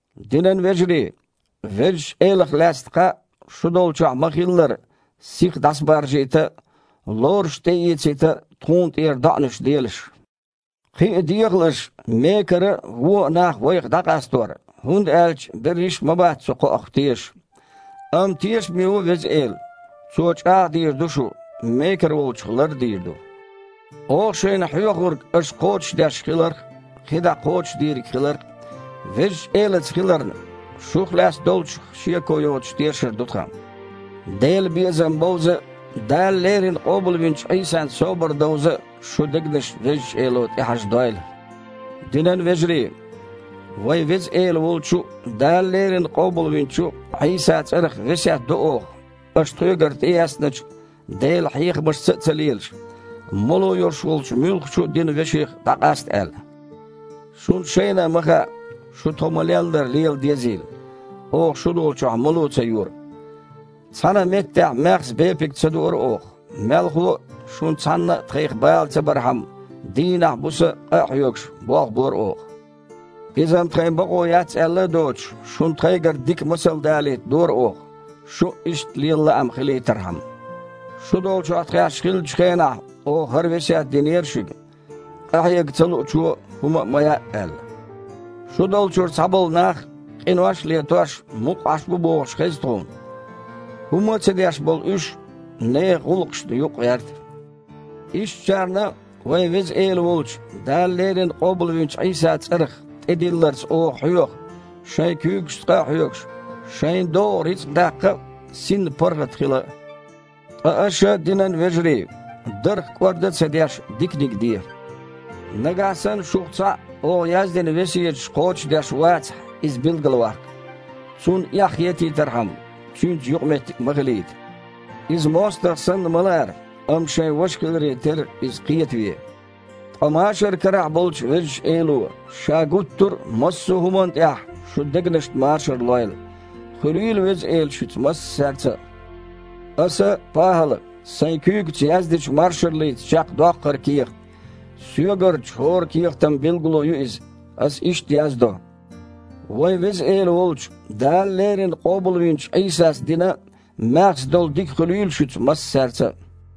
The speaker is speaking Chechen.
Динан вежарий! Везачу Элах лаьцна кхаъ, шу долчохь ма-хиллара, сиха дІасабаржийта а, лоруш тІеэцийта а тхуна тІера доІанаш делаш. Кхин а дехалаш мекара а, вон а нах вайх дІакъастор, хІунда аьлча берриш а ма бац цу кхоах тешаш. Амма тешаме ву Веза Эла. Цо чІагІ а дийр ду шу, мекара волчух лар а дийр ду. Оха шайна хьоьхург аша кхочушдеш хиларх а, кхин дІа а кхочуш дийриг хиларх а Везачу Элаца хиларна, шух лаьцна долчух шеко йоцуш тешар ду тхан. Делан безам бовза а, Дала леррина къобалвинчу Іийсан собар довза а шун дегнаш Везачу Эло тІехьажадойла. Динан вежарий! Вайн Веза Эла волчу а, Дала леррина къобалвинчу а Іийсан цІарах весет до оха, аша тхоьгара тІеэцначу Делан хьехамашца а ца лелаш, мало йолуш волчу муьлххачу а динан веших дІакъаста аьлла. Шуна шайна а ма хаьа, шу, тхо ма-леллара, лела дезийла. Оха шу долчохь мало ца йора. Цхьанна а меттехь маьхза бепиг ца дуура оха. Мелхо а, шуна цхьанна а тхайх бала ца бархьама, дийнахь а, буса а, къа а хьоьгуш, болх бора оха. Иза-м тхайн бакъо яц аьлла а доцуш, шуна тхайгара дика масал далийта дора оха, шун а иштта лела лаам хилийтархьама. Шу долчохь тхаьш хиллачу хенахь, оха хІара весет динера шуьга: «Къахьега ца луучо хІума а ма яа», – аьлла. Шу долчуьра цхьаболу нах, къинош а летош, мукъа Іаш бу бохуш, хеза тхуна. ХІумма а ца деш болу уьш нехан гІуллакхашна чу юкъагІерта. Ишттачарна вайн Веза Эла волчу, Дала леррина къобалвинчу Іийсан цІарах тІедилларца оха хьоьху, шайн куьйгашца къа а хьоьгуш, шайна догІу рицкъа даккха а, синна паргІат хила а. Ткъа аша, динан вежарий, дарх кІорда а ца деш, диканиг де. Нагахь санна шух цхьаъ оха яздина весеташ кхочушдеш вацахь, иза билгалваккха. Цунна эхь хетийтархьама, цуьнца юкъаметтиг ма хилийта. Иза мостагІа санна ма лара, амма, шайн ваша хиларе терра, иза кхетаве. Ткъа машар карахь болчу Везачу Эло Ша гуттара а массо а хІуманна тІехь шун дегнашна машар лойла. Хуьлийла Веза Эла шуьца массаьрца а! Аса, ПахІала, сайн куьйгаца яздечу маршаллица чекхдоккху хІара кехат. Соьгарчу хІора кехатан билгало ю иза. Аса иштта яздо: Вайн Веза Эла волчу, Дала леррина къобалвинчу Іийсас дина маьхза долу дика хуьлийла шуьца массаьрца а.